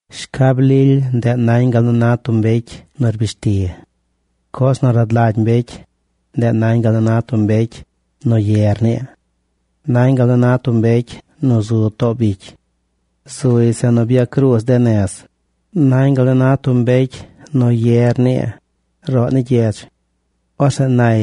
Shcab lily ndeꞌ nañ gal nu na tub mbecy nu rbish ti. Coz nu rad lagy mbecy, ndeꞌ nañ gal na tub mbecy nu ye rnii. Nañ gal nu na tub mbecy nu zu too bicy. Zuy zeꞌ nu byacruuz de nez. Nañ gal nu na tub mbecy nu rnii ye roꞌ ni gyedz. Orzeꞌ nay: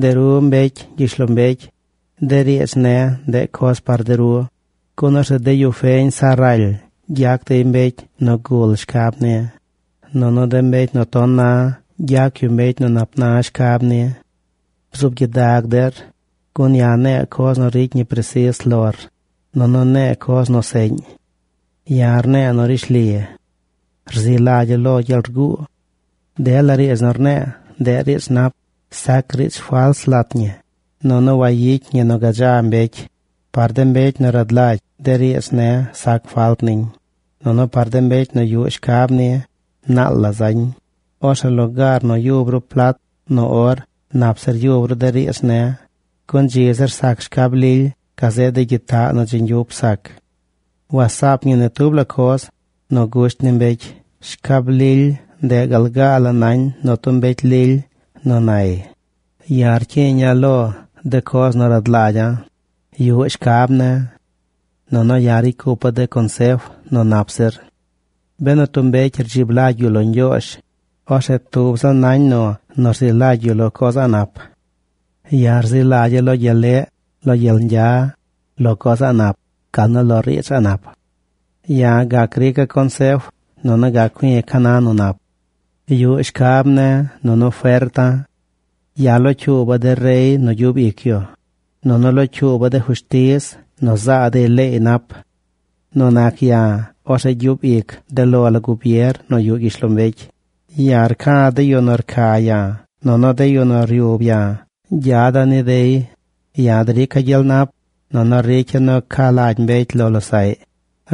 “De ru, mbecy gyishlombecy, de riidz ne̱, ndeꞌ coz par de ru, gun orzeꞌ de yu feñ sa raly gyac dey mbecy nu gul shcab ni, nunu de mbecy ton na gyac yu mbecy nu nap na shcab ni. Bzuub gyidag der, gun ya̱ ne̱e̱ coz nu ricy ñi presis lor, nunu ne̱e̱ coz nu seꞌñ. Ya̱ rne̱e̱ nu rishli. Rzi lagya̱ lo gyel rguu. Dela riidz nu rne̱e̱, ndeꞌ riidz nap. Sac riidz fals lat ñi, nunu wayicy ñi nu gadza mbecy. Par de mbecy nu rad lagy, de riidz ne̱ sac falt niñ, nunu par de mbecy nu yuꞌ shcab ni, naal zañ. Orzeꞌ lugaar nu byub ru plat nu or, nap zir yub ru de riidz ne̱. Gun dzi zir sac shcab lily gazeꞌ de gyitaꞌ nu dzi ñgyup sac. ¡Wasaap ñi ni tub la coz nu gusht ni mbecy!” Shcab lily, ndeꞌ gal gaa la nañ nu tub mbecy lily nu nay: “Ya̱ rcyiiña̱ lo de coz nu rad lagya̱. Yuꞌ shcab ne̱. Nunu ya̱ ricy cupa̱ de consef nu nap zir. Benu tub mbecy rdzib lagy yu lo Ñgyoozh, orzeꞌ tub ziꞌl nañ nu rzi lagy yu lo coz a̱ꞌ nap. Ya̱ rzi lagya̱ lo gyel leꞌ, lo gyel ñgya, lo coz a̱ꞌ nap, gal nu lo riidz a̱ꞌ nap. Ya̱ gac rica̱ consef, nunu gac cui̱ ca na nu nap. Yuꞌ shcab ne̱, nunu ferta̱. Ya̱ locyuuba̱ de rey nu gyub ic yu, nunu locyuuba̱ de fushtiz nu zaa dey leey nap. Nu nac ya̱, orzeꞌ gyub ic de lo la gubier nu yuꞌ gyishlombecy. Ya̱ rca̱ de yu nu rca ya̱, nunu de yu nu ryub ya̱, gyada̱ ni dey. Ya̱ drica̱ gyel nap. Nunu ricya̱ nu ca lagy mbecy lo losaꞌy.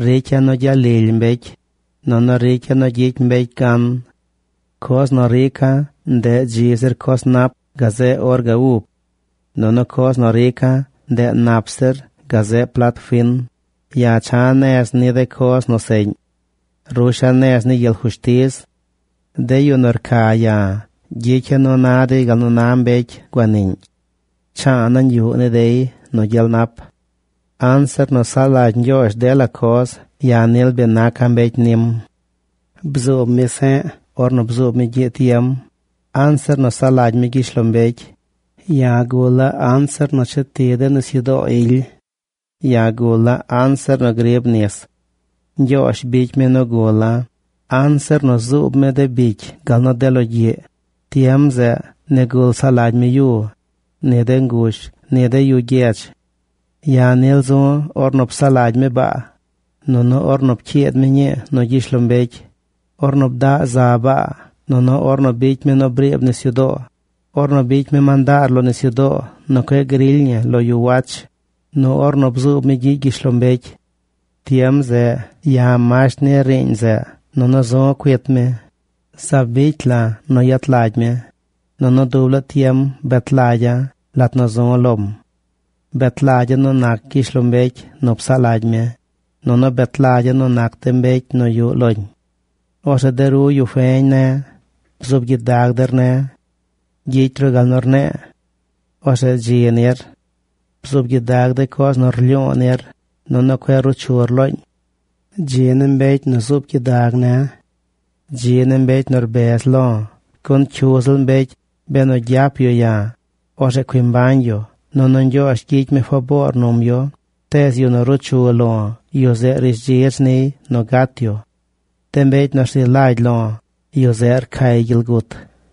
Ricya̱ nu gyalily mbecy. Nunu ricya̱ nu gyicy mbecy gan. Coz nu rica̱, ndeꞌ dzi zir coz nap gazeꞌ or ga ub. Nunu coz nu rica̱, ndeꞌ nap zir gazeꞌ plat fin. Ya̱ cha̱ nez ni de coz nu seꞌñ. Rusha̱ nez ni gyel fushtiz. De yu nu rca ya̱, gyicya̱ nu na dey gal nu na mbecy guaniꞌñ. Cha̱a̱ nañ yuꞌ ni dey nu gyel nap. “Anzir nu saꞌ lagy Ñgyoozh, dela coz, ya̱ nil bi naca̱ mbecy nim. Bzuub mi se̱ꞌ ornu bzub gyiꞌ tiem, anzir nu saꞌ lagy mi gyishlombecy. Ya̱ gula̱ anzir nu cheti de nisyudoo ily. Ya̱ gula̱ anzir nu griib nis. Ñgyoozh bicy mi nu gula̱ anzir nu zuub mi de bicy gal nu de logyiꞌ. Tiem zeꞌ nigul saꞌ lagy mi yu, ni de ngush, ni de yu gyedz. Ya̱ nil zu̱ ornu psaꞌ lagy mi baa, nunu ornu pcyiid mi ñii nu gyishlombecy, ornu bdaꞌ za baa, nunu ornu bicy mi nu briib nisyudoo, ornu bicy mi mandaar lo nisyudoo nu cueꞌ grily ñi lo yu wach, nu ornu bzuub mi gyiꞌ gyishlombecy. Tiem zeꞌ ya̱ masht ni riiñ zeꞌ nunu zu̱ cuit mi. Zaab bicy la̱ nu yet lagy mi. Nunu dub laa tiem bet lagya̱ lat nu zu̱ lom. Bet lagya̱ nu nac gyishlombecy nu psaꞌ lagy mi, nunu bet lagya̱ nu nac de mbecy nu yuꞌ loñ. “Orzeꞌ de ru, yu feñ ne̱, bzuub gyidag der ne̱. Gyicy ru gal nu rne̱e̱. Orzeꞌ dzi nir. Bzuub gyidag de coz nu rlyu̱u̱ nir, nunu cueꞌ ruu chur looñ. Dzi ni mbecy nu zuub gyidag ne̱. Dzi ni mbecy nu rbez lo̱. Gun cyu ziꞌl mbecy benu gyap yu ya̱, orzeꞌ cui mbañ yu, nunu Ñgyoozh gyicy mi faboor num yu. Tees yu nu ruu chu lo̱, yu zeꞌ rishdzidz niy nu gat yu. De mbecy nu rzi lagy lo̱, yu zeꞌ rcay gyel gut.”